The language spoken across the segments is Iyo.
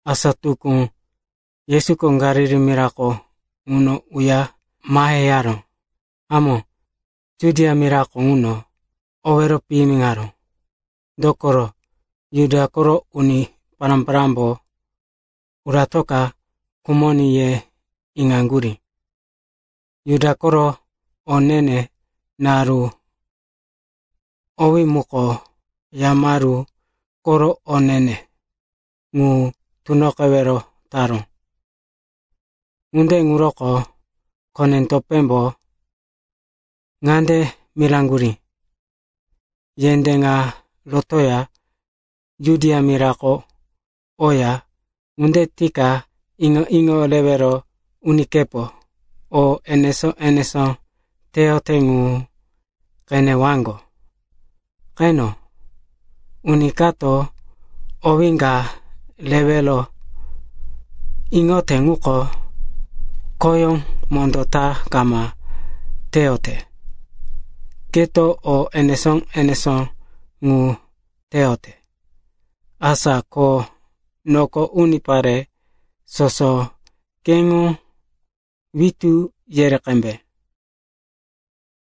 Asa tukú, Yesuko Galili mirako ŋuno uya maheyaró. Hamó, Judia mirako ŋuno owero piyimiŋaró, dokoro Juda koro uni pará-parámbo, uratoka khumoní, ye iŋaŋgurí. Juda koro o ne-ne naru owí muko Yamaru koro o ne-ne ŋu tunoqewero taró. Ŋunde ŋuroko kone-topémbo ŋande miraŋgurí, “Yendé ŋa rotoya Judia mirako oya. Ŋunde tika iŋo-iŋo rewero unikepo o enesó-enesó teyote ŋu qenewaŋgo. Qeno, uni kato owé ka rewero iŋote ŋuko khoyó mondó ta kama teyote. Keto o enesó-enesó ŋu teyote, asa ko noko unipare soso keŋo witú yere qembe.”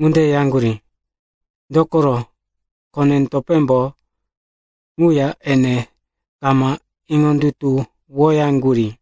Ŋunde yaŋgurí, dokoro kone-topémbo ŋuya ene kama iŋondutuwoyaŋgurí.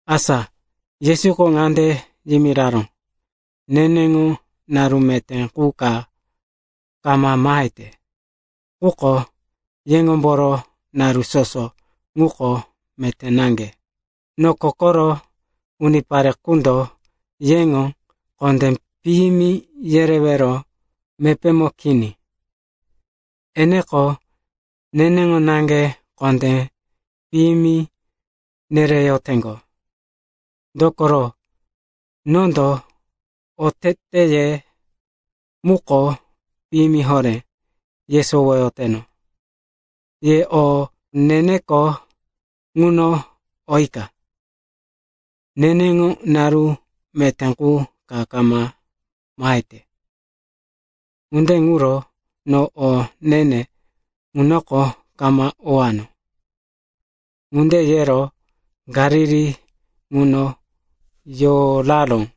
Asa Yesuko ŋande yimiraró, “Neneŋo naru meté qu ka kama mahete. Quko yeŋomboro naru soso ŋuko meté naŋge. Noko koro unipare qundo yeŋo kondé piyimi yerewero mepémo kini. Eneko neneŋo naŋge kondé piyimi nereyoteŋgo, dokoro nondo oteteye muko piyimi horé yesowoyoteno. Ye o ne-neko ŋuno oyika. Neneŋo naru meté qu ka kama mahete, ŋunde ŋuro no o ne-ne ŋunoko kama owano.” Ŋunde yero Galili ŋuno yoraró.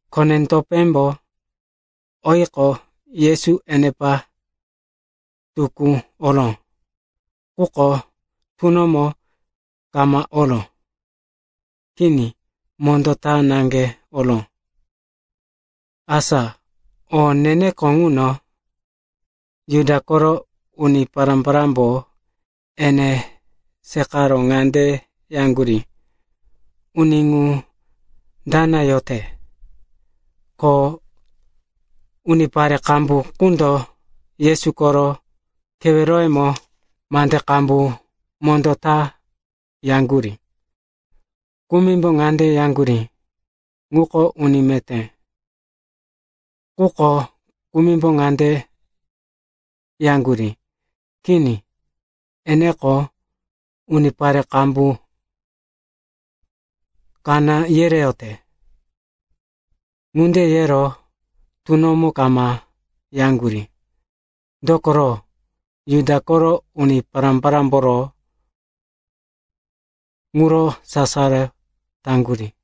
Kone-topémbo oyiqo, Yesu enepa tukú oró. Quko tunomo kama oró. Kini mondó ta naŋge oró. Asa o ne-neko ŋuno, Juda koro uni pará-parámbo ene seqaro ŋande yaŋgurí, “Uni ŋu dana yote?” Ko unipare qambu ŋundo Yesu koro keweroyemo mande qambu mondó ta yaŋgurí. Kumimbo ŋande yaŋgurí, “Ŋuko uni meté.” Quko kumimbo ŋande yaŋgurí, “Kini, enendo unipare qambu kaná yereyote.” Ŋunde yero tunomo kama yaŋgurí, dokoro Juda koro uni pará-parámboro ŋuro sasaro taŋgurí.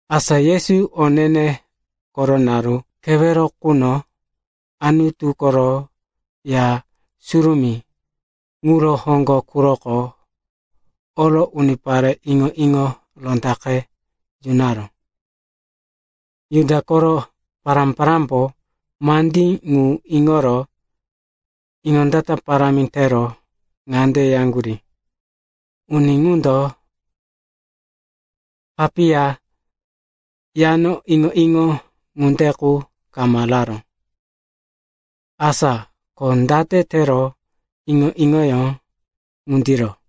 Asa Yesu o ne-ne koro naru kewero quno Anutu koro Ya Surumí ŋuro hoŋgo quroko oro unipare iŋo-iŋo rondaqe yunaró. Juda koro uni pará-parámbo mandí ŋu iŋoro iŋondata parámi tero ŋande yaŋgurí, “Uni ŋundo papiya yano iŋo-iŋo ŋunde qu kama raró. Asa ko date tero iŋo-iŋoyó ŋundiro?”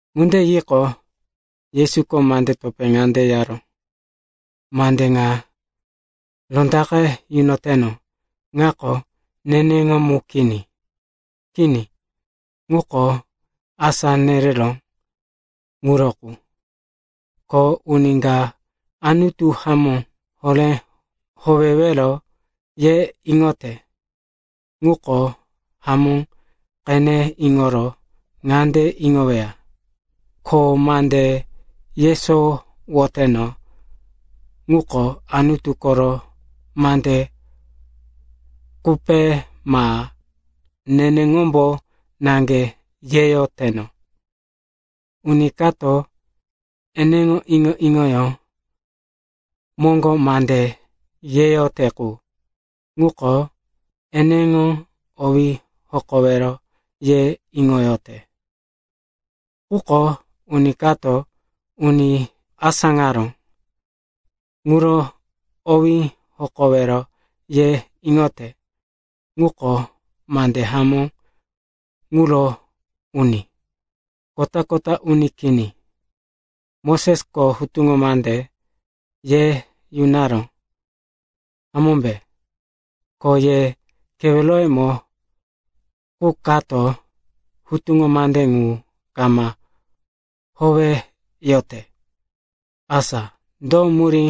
Ŋunde yiqo, Yesuko mande topé ŋande yaró, “Mande ŋa rondaqe yunoteno ŋako neneŋo mu kini. Kini, ŋuko asá nereró ŋuro qu. Ko uni ka Anutu hamó horé howewero ye iŋoyote ŋuko hamó qene iŋoro ŋande iŋoweya, ko mande yesowoteno ŋuko Anutu koro mande qupe ma neneŋombo naŋge yeyoteno. Uni kato eneŋo iŋo-iŋoyó moŋgo mande yeyote qu, ŋuko eneŋo owí hokowero ye iŋoyote. Quko uni kato uni asáŋaró ŋuro owí hokowero ye iŋote ŋuko mande hamó ŋuro uni, kota-kota uni kini. Mosesko hutuŋo mande ye yunaró, hamómbe? Ko ye keweroyemo qu kato hutuŋo mande ŋu kama howeyote. Asa do murí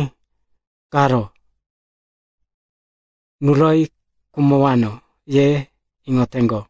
karo, nuroyi khumowano, ye iŋoteŋgo?”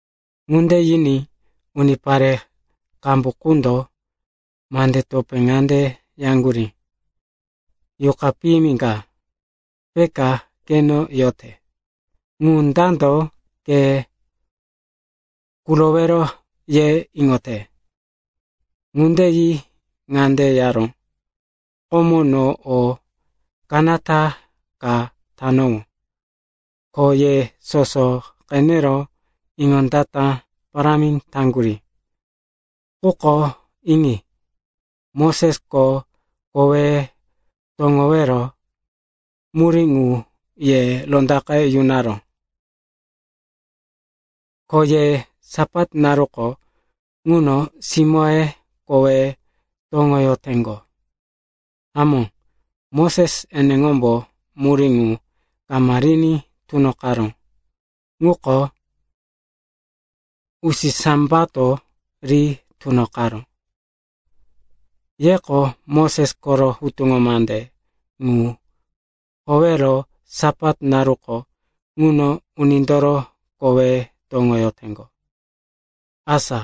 Ŋunde yiní unipare qambu ŋundo mande topé ŋande yaŋgurí, “Yuqa piyimi ka peka keno yote. Ŋu dando ke kurowero, ye iŋote?” Ŋunde yi ŋande yaró, “Komo no o kanata ka tanowó, ko ye soso qenero iŋondata parámi taŋgurí. Quko iŋi. Mosesko koweye toŋowero murí ŋu ye rondaqe yunaró, ko ye Sapat naruko ŋuno simóye koweye toŋoyoteŋgo. (Hamó, Moses eneŋombo murí ŋu kama riní tunoqaró. Ŋuko usisambato ri tunoqaró.) Yeko Moses koro hutuŋo mande ŋu howero Sapat naruko ŋuno unindoro kowí toŋoyoteŋgo. Asa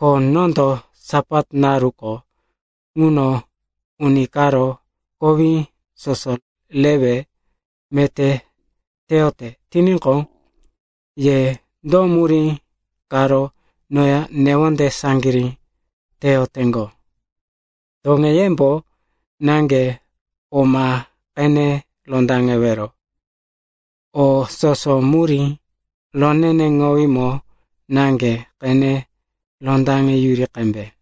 ko nondo Sapat naruko ŋuno uni karo kowí soso rewe meté teyote tiníqo, ye do murí karo noya newonde saŋgirí teyoteŋgo? Toŋeyembo naŋge o ma qene rondaŋewero. O soso murí roneneŋowímo naŋge qene rondaŋeyuri qembe.”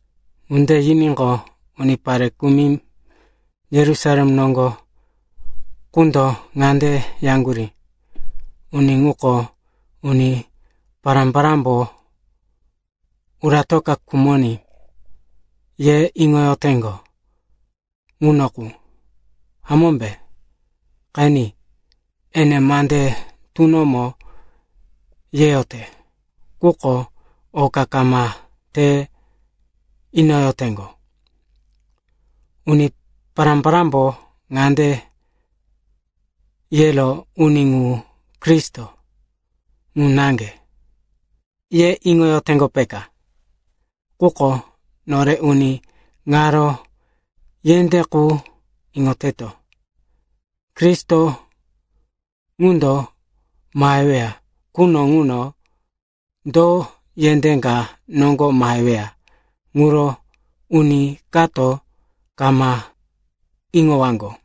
Ŋunde yiníqo, unipare kumi Yerusalem noŋgo qundo ŋande yaŋgurí, “Uni ŋuko uni pará-parámbo, uratoka khumoní, ye iŋoyoteŋgo ŋuno qu, hamómbe? Qeni. Ene mande tunomo yeyote, quko oka kama te inoyoteŋgo. Uni pará-parámbo ŋande yero, uni ŋu Kristo ŋu naŋge, ye iŋoyoteŋgo, peka. Quko nore uni ŋaro yendé qu iŋoteto. Kristo ŋundo maheweya quno ŋuno do yendé ka noŋgo maheweya ŋuro uni kato kama iŋowaŋgo.”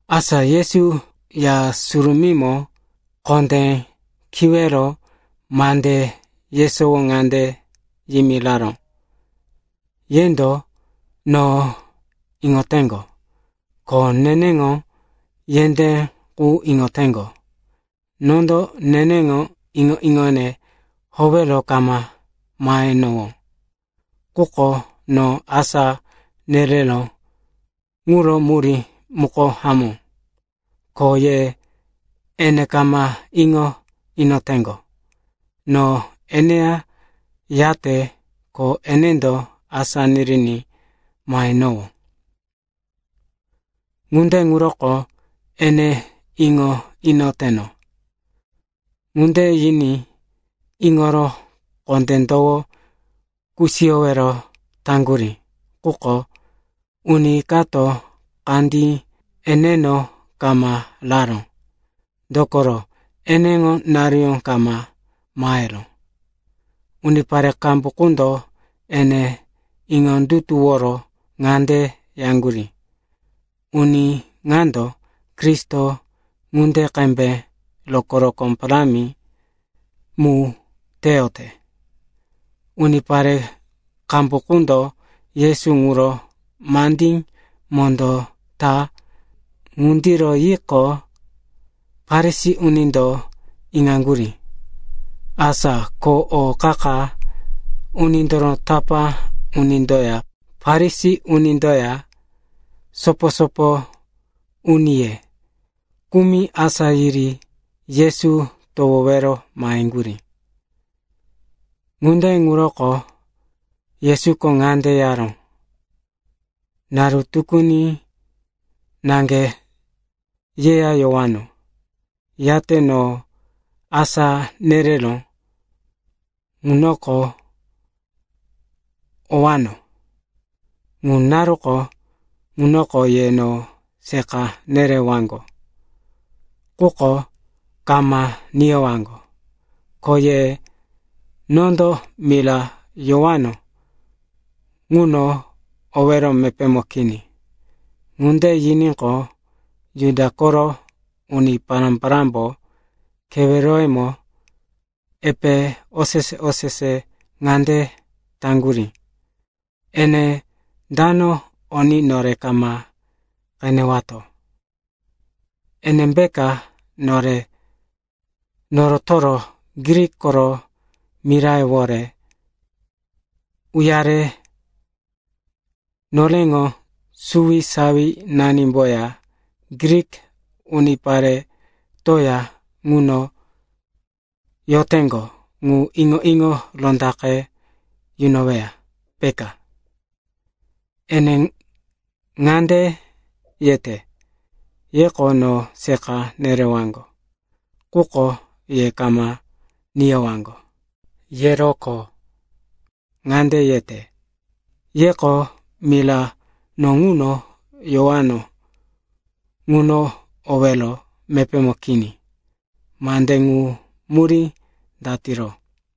Asa Yesu Ya Surumímo kondé kiwero mande yesowo ŋande yimiraró, “Yendo no iŋoteŋgo, ko neneŋo yendé qu iŋoteŋgo. Nondo neneŋo iŋo-iŋone howero kama mahenowó. Quko no asá nereró ŋuro murí muko hamó, ko ye ene kama iŋo inoteŋgo. No eneya yate, ko enendo asá niriní mahenowó. Ŋunde ŋuroko ene iŋo inoteno.” Ŋunde yiní iŋoro kondé towo kusiyowero taŋgurí. Quko uni kato kandí eneno kama raró, dokoro eneŋo naruyó kama maheró. Unipare qambu qundo ene iŋondutuworo ŋande yaŋgurí, “Uni ŋando Kristo ŋunde qembe rokó-rokó parámi mu teyote.” Unipare qambu qundo Yesu ŋuro mande mondó ta ŋundiro yiqo, Farisi unindo iŋaŋgurí. Asa ko o qa-qa unindoro tapá unindoya Farisi unindoya sopo-sopo uniye kumi asá yiri Yesu towowero maheŋgurí. Ŋunde ŋuroko Yesuko ŋande yaró, “Naru tukuni naŋge yeya yowano, yate no asá nereró ŋunoko owano. Ŋu naruko ŋunoko ye no seqa nerewaŋgo, quko kama niyowaŋgo. Ko ye nondo mira yowano ŋuno owero mepémo kini.” Ŋunde yiníqo, Juda koro uni pará-parámbo keweroyemo epe osese-osese ŋande taŋgurí, “Ene dano oní nore kama qenewato? Enembeka nore norotoro Grik koro mirayewore uyare noreŋo suwisawinanimboya Grik uniparetoya ŋuno yoteŋgo ŋu iŋo-iŋo rondaqe yunoweya, peka? Ene ŋande yete, ‘Yeko no seqa nerewaŋgo, quko ye kama niyowaŋgo.’ Yero ko ŋande yete, ‘Yeko mira no ŋuno yowano ŋuno owero mepémo kini.’ Mande ŋu murí datiro?”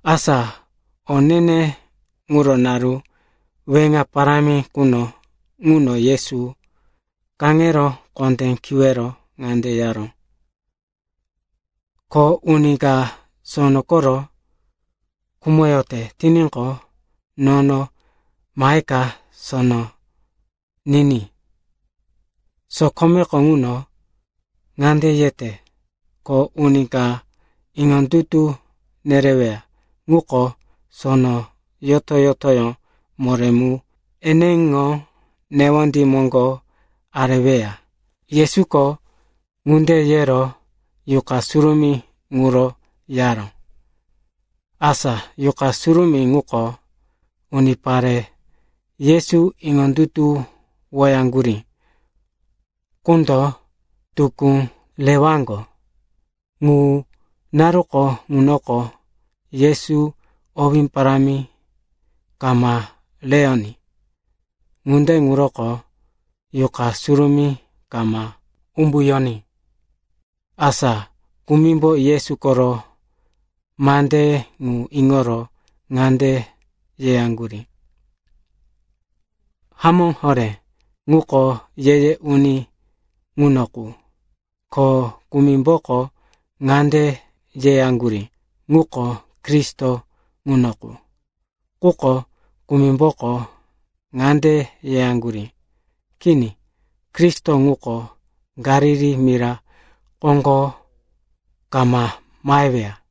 Asa o ne-ne ŋuro naru weŋa parámi quno ŋuno Yesu kaŋero kondé kiwero ŋande yaró, “Ko uni ka sono koro khumoyote tiníqo, nono maheka sono niní. Sokomeko ŋuno ŋande yete, ko uni ka iŋondutu nereweya ŋuko, sono yoto-yotoyó moré mu eneŋo newondí moŋgo areweya.” Yesuko ŋunde yero Yuqa Surumí ŋuro yaró, asa Yuqa Surumí ŋuko unipare Yesu iŋondutuwoyaŋgurí qundo tukú rewaŋgo. Ŋu naruko ŋunoko Yesu owé parámi kama reyoní, ŋunde ŋuroko Yuqa Surumí kama umbuyoní. Asa kumimbo Yesu koro mande ŋu iŋoro ŋande yeyaŋgurí, “Hamó horé ŋuko ye-ye uni ŋuno qu.” Ko kumimboko ŋande yeyaŋgurí, “Ŋuko Kristo ŋuno qu.” Quko kumimboko ŋande yeyaŋgurí, “Kini, Kristo ŋuko Galili mira koŋgo kama maheweya.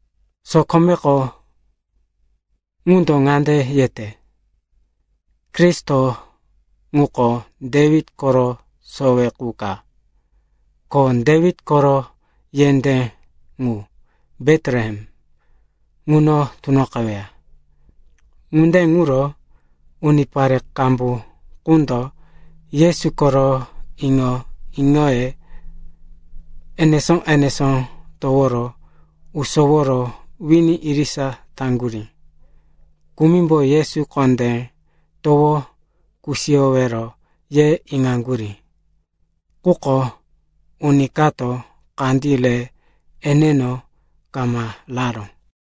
Sokome ŋundo ŋande yete, Kristo ŋuko Dewit koro sowe qu ka, ko Dewit koro yendé ŋu, Betlehem, ŋuno tunoqeweya.” Ŋunde ŋuro unipare qambu ŋundo Yesu koro iŋo-iŋoye enesó-enesó toworo usoworo wini irisa taŋgurí. Kumimbo Yesu kondé towo kusiyowero ye iŋaŋgurí, quko uni kato kandí re eneno kama raró.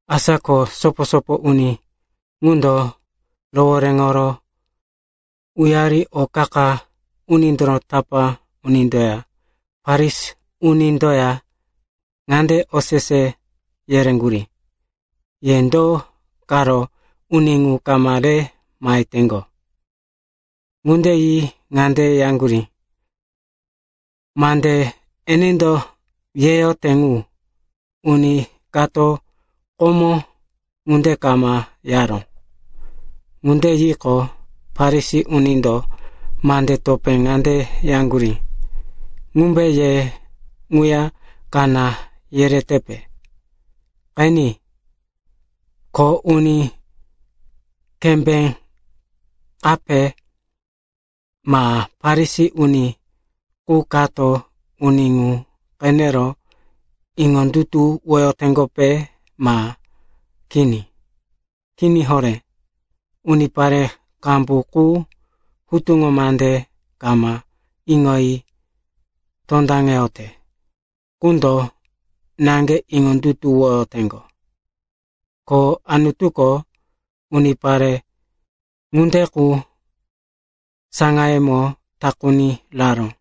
Asa ko sopo-sopo uni ŋundo rohoréŋo uyari o qa-qa unindoro tapá unindoya Farisi unindoya ŋande osese yereŋgurí, “Ye do karo uni ŋu kama re maheteŋgo?” Ŋunde yi ŋande yaŋgurí, “Mande enendo yeyote ŋu, uni kato komo ŋunde kama yaró.” Ŋunde yiqo, Farisi unindo mande topé ŋande yaŋgurí, “Ŋumbe ye ŋuya kaná yeretepe? Qeni, ko uni kembé kape ma Farisi uni qu kato uni ŋu qenero iŋondutuwoyoteŋgope ma kini? Kini horé. Unipare qambu qu hutuŋo mande kama iŋoyi tondaŋeyote ŋundo naŋge iŋondutuwoyoteŋgo. Ko Anutuko unipare ŋunde qu saŋayemo takuni raró.”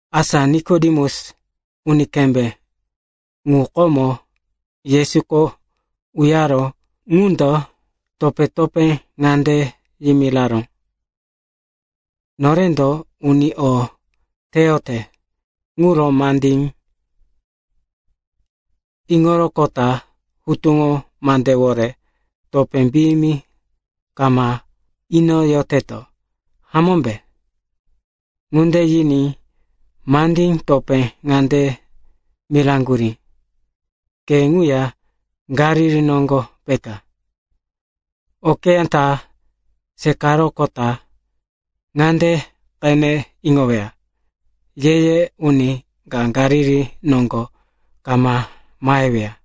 Asa Nikodemus, uni kembé ŋu komo Yesuko uyaró ŋundo topé-topé ŋande yimiraró, “Norendo uni o teyote ŋuro mandí iŋoroqota hutuŋo mandewore topé piyimi kama inoyoteto, hamómbe?” Ŋunde yiní mandí topé ŋande miraŋgurí, “Ke ŋuya Galili noŋgo peka? Okeyá ta seqaroqota ŋande qene iŋoweya, ye-ye uni ka Galili noŋgo kama maheweya.”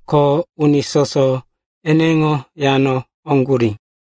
Ko uni soso eneŋo yano oŋgurí.